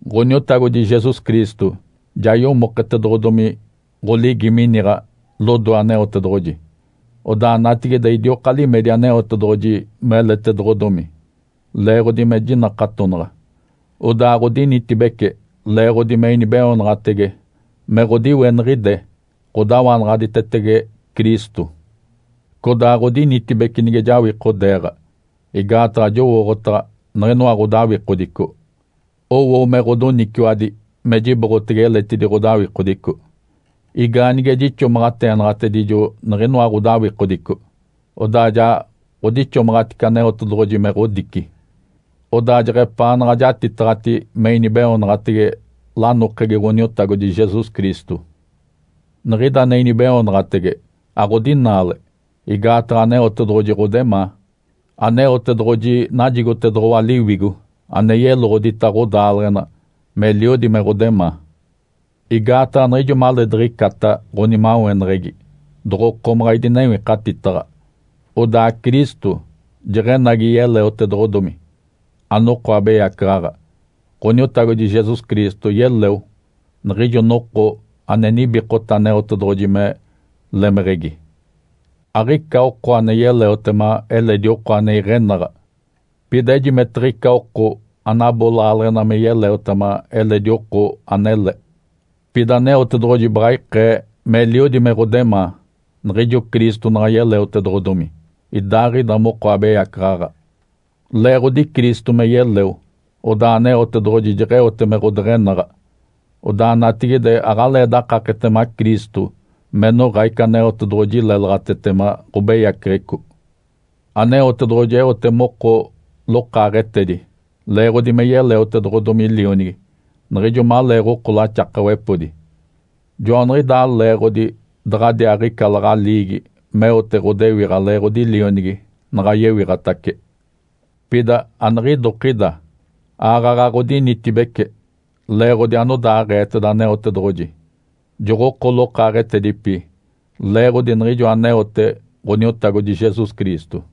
Ǥoniotagodi Jesus Cristo ja yomoketedoɡ̶odomi ɡ̶oligi miniɡ̶a lodoe Aneotedoɡ̶oji. Odaa natigide idioka limedi Aneotedoɡ̶oji meletedoɡ̶odomi leeɡ̶odi me jinakatonaɡ̶a. Odaa ɡ̶odinitibece leeɡ̶odi me inibeoonaɡ̶atege me ɡ̶odiweniɡ̶ide ɡ̶odawanaɡ̶aditetege Cristo. Codaa ɡ̶odinitibece nige jawikodeeɡ̶a, igaataɡ̶a jowooɡ̶otaɡ̶a niɡ̶inoa ɡ̶odawikodico owo me ɡ̶odoniciwadi me jiboɡ̶atege eletidi ɡ̶odawikodico. Igaanige jixomaɡ̶ateenaɡ̶atedijo niɡ̶inoa ɡ̶odawikodico, odaa ja ɡ̶odixomaɡ̶atice Aneotedoɡ̶oji me ɡ̶odici. Odaa jeɡ̶epaanaɡ̶a jatitaɡ̶ati me inibeoonaɡ̶atege lanokegi Ǥoniotagodi Jesus Cristo. Niɡ̶ida ane inibeoonaɡ̶atege aɡ̶odinaale, igaataɡ̶a Aneotedoɡ̶oji ɡ̶odemaa. Aneotedoɡ̶oji najigotedoɡ̶owa Liwigo ane yeloɡ̶odita ɡ̶odaaleɡ̶ena meliodi me ɡ̶odemaa. Igaataɡ̶a niɡ̶ijo maleediɡ̶icata ɡ̶onimaweneɡ̶egi doɡ̶okomaɡ̶a idinewikatitaɡ̶a, odaa Cristo jeɡ̶enagi yeleotedoɡ̶odomi, anoko abeyacaɡ̶aɡ̶a. Ǥoniotagodi Jesus Cristo yeleo niɡ̶ijo noko ane nibikota Aneotedoɡ̶oji me lemeɡ̶egi. Aɡ̶ica oko ane yeleotema eledi oko ane iɡ̶enaɡ̶a. Pida ejimetiɡ̶ica oko anabo laaleɡ̶ena me yeleotema eledi oko anele. Pida Aneotedoɡ̶oji baɡ̶a ikee meliodi me ɡ̶odemaa niɡ̶ijo Cristo naɡ̶a yeleotedoɡ̶odomi, idaaɡ̶ida moko abeyacaɡ̶aɡ̶a. Leeɡ̶odi Cristo me yeleo, odaa Aneotedoɡ̶oji jeɡ̶eote me ɡ̶odeɡ̶enaɡ̶a. Odaa natigide aɡ̶alee dakaketema Cristo me noɡ̶a ica Aneotedoɡ̶oji lélaɡ̶atetema ɡ̶obeyaceɡ̶eco. Aneotedoɡ̶oji eote moko lokaaɡ̶etedi leeɡ̶odi me yeleotedoɡ̶odomi Lionigi niɡ̶ijo maleeɡ̶oko laxakawepodi. Joaniɡ̶idaa leeɡ̶odi daɡ̶adiaaɡ̶ica laɡ̶aliigi meote ɡ̶odewiɡ̶a leeɡ̶odi Lionigi naɡ̶a yewiɡ̶atace. Pida aniɡ̶idokida. Aaɡ̶aɡ̶a ɡ̶odinitibece leeɡ̶odi anodaaɡ̶eeteda Aneotedoɡ̶oji. Joɡ̶oko lokaaɡ̶etedipi leeɡ̶odi niɡ̶ijo aneote Ǥoniotagodi Jesus Cristo.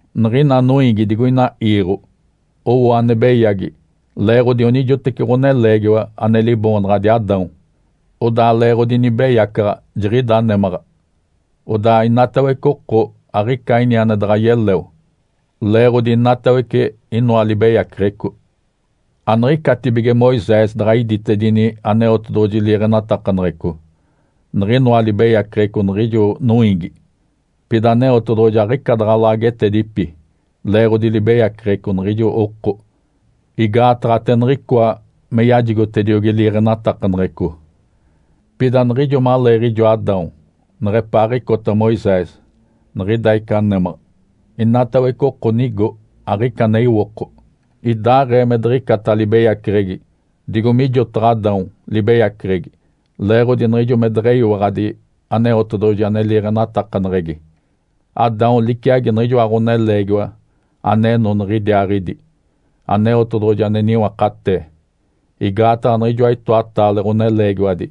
Niɡ̶ina noiigi digoina iiɡ̶o owo ane beyagi leeɡ̶odi onijoteci ɡ̶oneleegiwa ane liboonaɡ̶adi Adão. Odaa leeɡ̶odi nibeyacaɡ̶a, jiɡ̶ida némaɡ̶a. Odaa inatawece oko aɡ̶ica ini ane daɡ̶a yeleo leeɡ̶odi inatawece inoa libeyaceɡ̶eco. Aniɡ̶icatibige Moisés daɡ̶a iditedini Aneotedoɡ̶oji liiɡ̶enatakaneɡ̶eco, niɡ̶inoa libeyaceɡ̶eco niɡ̶ijo noiigi. Pida Aneotedoɡ̶oji aɡ̶ica daɡ̶a laagetedipi leeɡ̶odi libeyaceɡ̶eco niɡ̶ijo oko. Igaataɡ̶a ate niɡ̶icoa me yajigotediogi liiɡ̶enatakaneɡ̶eco. Pida niɡ̶ijo maleeɡ̶ijo Adão neɡ̶epaaɡ̶icota Moisés, niɡ̶ida ica némaɡ̶a. Inatawece oko nigo, aɡ̶ica ane iwoko, idaaɡ̶ee me diɡ̶icata libeyaceɡ̶egi digo mijotaɡ̶a Adão libeyaceɡ̶egi, leeɡ̶odi niɡ̶ijo me deɡ̶eyiwaɡ̶adi Aneotedoɡ̶oji ane liiɡ̶enatakaneɡ̶egi. Adão liciagi niɡ̶ijoa Ǥoneleegiwa aneno niɡ̶idiaaɡ̶idi, Aneotedoɡ̶oji ane niwakatee. Igaataɡ̶a niɡ̶ijoa itoataale ɡ̶oneleegiwadi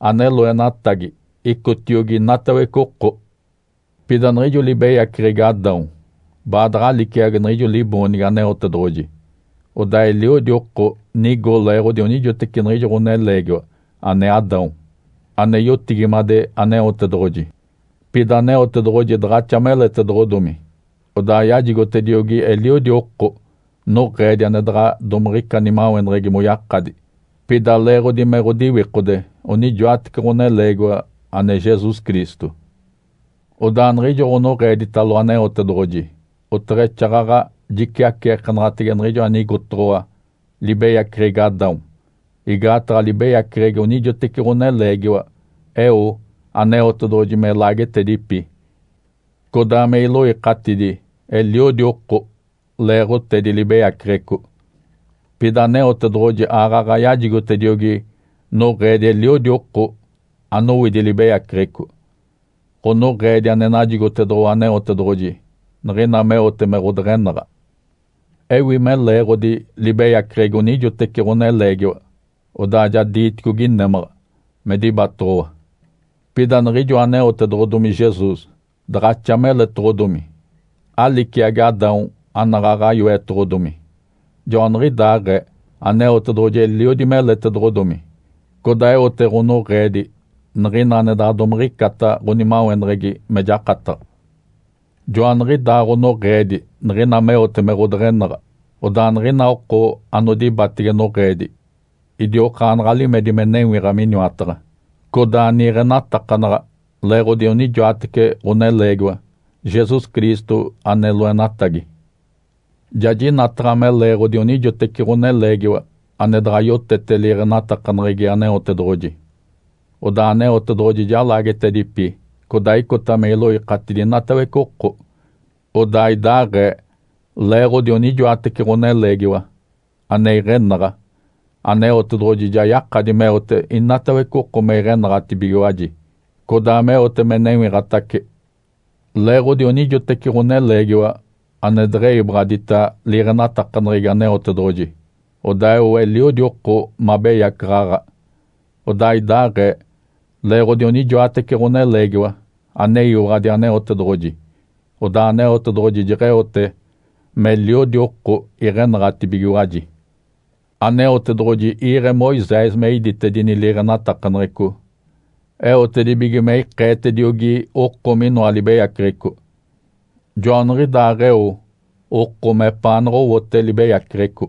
ane loenatigi icotiogi inatawece oko. Pida niɡ̶ijo libeyaceɡ̶egi Adão baadaɡ̶a liciagi niɡ̶ijo liboonigi Aneotedoɡ̶oji. Odaa eliodi oko nigo leeɡ̶odi onijoteci niɡ̶ijo ɡ̶oneleegiwa, ane Adão, ane yotigimade Aneotedoɡ̶oji. Pida Aneotedoɡ̶oji daɡ̶axa meletedoɡ̶odomi, odaa yajigotediogi eliodi oko noɡ̶eedi ane daɡ̶a domiɡ̶ica nimaweneɡ̶egi moyakadi, pida leeɡ̶odi me ɡ̶odiwikode onijoatece ɡ̶oneleegiwa ane Jesus Cristo. Odaa niɡ̶ijo ɡ̶onoɡ̶eeditalo Aneotedoɡ̶oji oteɡ̶exaaɡ̶aɡ̶a jiciaceekenaɡ̶atege niɡ̶ijo anigotoɡ̶owa libeyaceɡ̶egi Adão. Igaataɡ̶a libeyaceɡ̶egi onijoteci ɡ̶oneleegiwa eo Aneotedoɡ̶oji me laagetedipi, codaa me iloikatidi eliodi oko leeɡ̶otedi libeyaceɡ̶eco. Pida Aneotedoɡ̶oji aaɡ̶aɡ̶a yajigotediogi noɡ̶eedi eliodi oko anowidi libeyaceɡ̶eco. Ǥonoɡ̶eedi ane najigotedoɡ̶owa Aneotedoɡ̶oji niɡ̶ina meote me ɡ̶odeɡ̶enaɡ̶a. Ewi me leeɡ̶odi libeyaceɡ̶egi onijoteci ɡ̶oneleegiwa odaa ja diiticogi némaɡ̶a me dibatoɡ̶owa. Pida niɡ̶ijo aneotedoɡ̶odomi Jesus daɡ̶axa meletoɡ̶odomi, aliciagi Adão anaɡ̶aɡ̶a yoetoɡ̶odomi. Joaniɡ̶idaaɡ̶ee, Aneotedoɡ̶oji eliodi meletedoɡ̶odomi, codaa eote ɡ̶onoɡ̶eedi niɡ̶ina ane daɡ̶a domiɡ̶icata ɡ̶onimaweneɡ̶egi me jakataɡ̶a. Joaniɡ̶idaa ɡ̶onoɡ̶eedi niɡ̶ina meote me ɡ̶odeɡ̶enaɡ̶a. Odaa niɡ̶ina oko anodibatege noɡ̶eedi idiokaanaɡ̶a limedi me newiɡ̶a miniwataɡ̶a, codaa niiɡ̶enatakanaɡ̶a leeɡ̶odi onijoatece ɡ̶oneleegiwa Jesus Cristo ane loenatagi. Ja jinataɡ̶a me leeɡ̶odi onijoteci ɡ̶oneleegiwa ane daɡ̶a yotete liiɡ̶enatakaneɡ̶egi Aneotedoɡ̶oji, odaa Aneotedoɡ̶oji ja laagetedipi codaa icota me iloikatidi inatawece oko. Odaa idaaɡ̶ee, leeɡ̶odi onijoatece ɡ̶oneleegiwa ane iɡ̶enaɡ̶a, Aneotedoɡ̶oji ja yakadi meote inatawece oko me iɡ̶enaɡ̶atibigiwaji, codaa meote me newiɡ̶atace. Leeɡ̶odi onijoteci ɡ̶oneleegiwa ane deɡ̶eyiwaɡ̶adita liiɡ̶enatakaneɡ̶egi Aneotedoɡ̶oji odaa eo eliodi oko mabeyacaɡ̶aɡ̶a. Odaa idaaɡ̶ee, leeɡ̶odi onijoatece ɡ̶oneleegiwa aneyiwaɡ̶adi Aneotedoɡ̶oji, odaa Aneotedoɡ̶oji jeɡ̶eote meliodi oko iɡ̶enaɡ̶atibigiwaji. Aneotedoɡ̶oji iiɡ̶e Moisés me iditedini liiɡ̶enatakaneɡ̶eco eotedibige me ikeetediogi oko minoa libeyaceɡ̶eco. Joaniɡ̶idaaɡ̶eo oko mepaanaɡ̶a owote libeyaceɡ̶eco.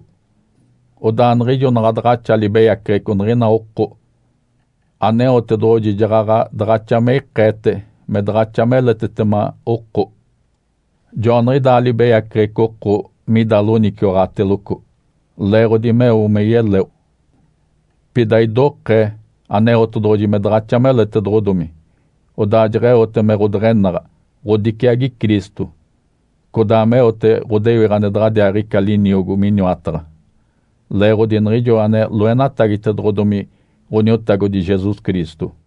Odaa niɡ̶ijo naɡ̶a daɡ̶axa libeyaceɡ̶eco niɡ̶ina oko, Aneotedoɡ̶oji jaɡ̶aɡ̶a daɡ̶axa me ikeete me daɡ̶axa meletetema oko. Joaniɡ̶idaa libeyaceɡ̶eco oko mida loniciwaɡ̶ateloco, leeɡ̶odi meo me yeleo. Pida idokee Aneotedoɡ̶oji me daɡ̶axa meletedoɡ̶odomi, odaa jeɡ̶eote me ɡ̶odeɡ̶enaɡ̶a, ɡ̶odiciagi Cristo, codaa meote ɡ̶odewiɡ̶a ane daɡ̶adiaaɡ̶ica liniogo Miniwataɡ̶a, leeɡ̶odi niɡ̶ijo ane loenatagitedoɡ̶odomi Ǥoniotagodi Jesus Cristo.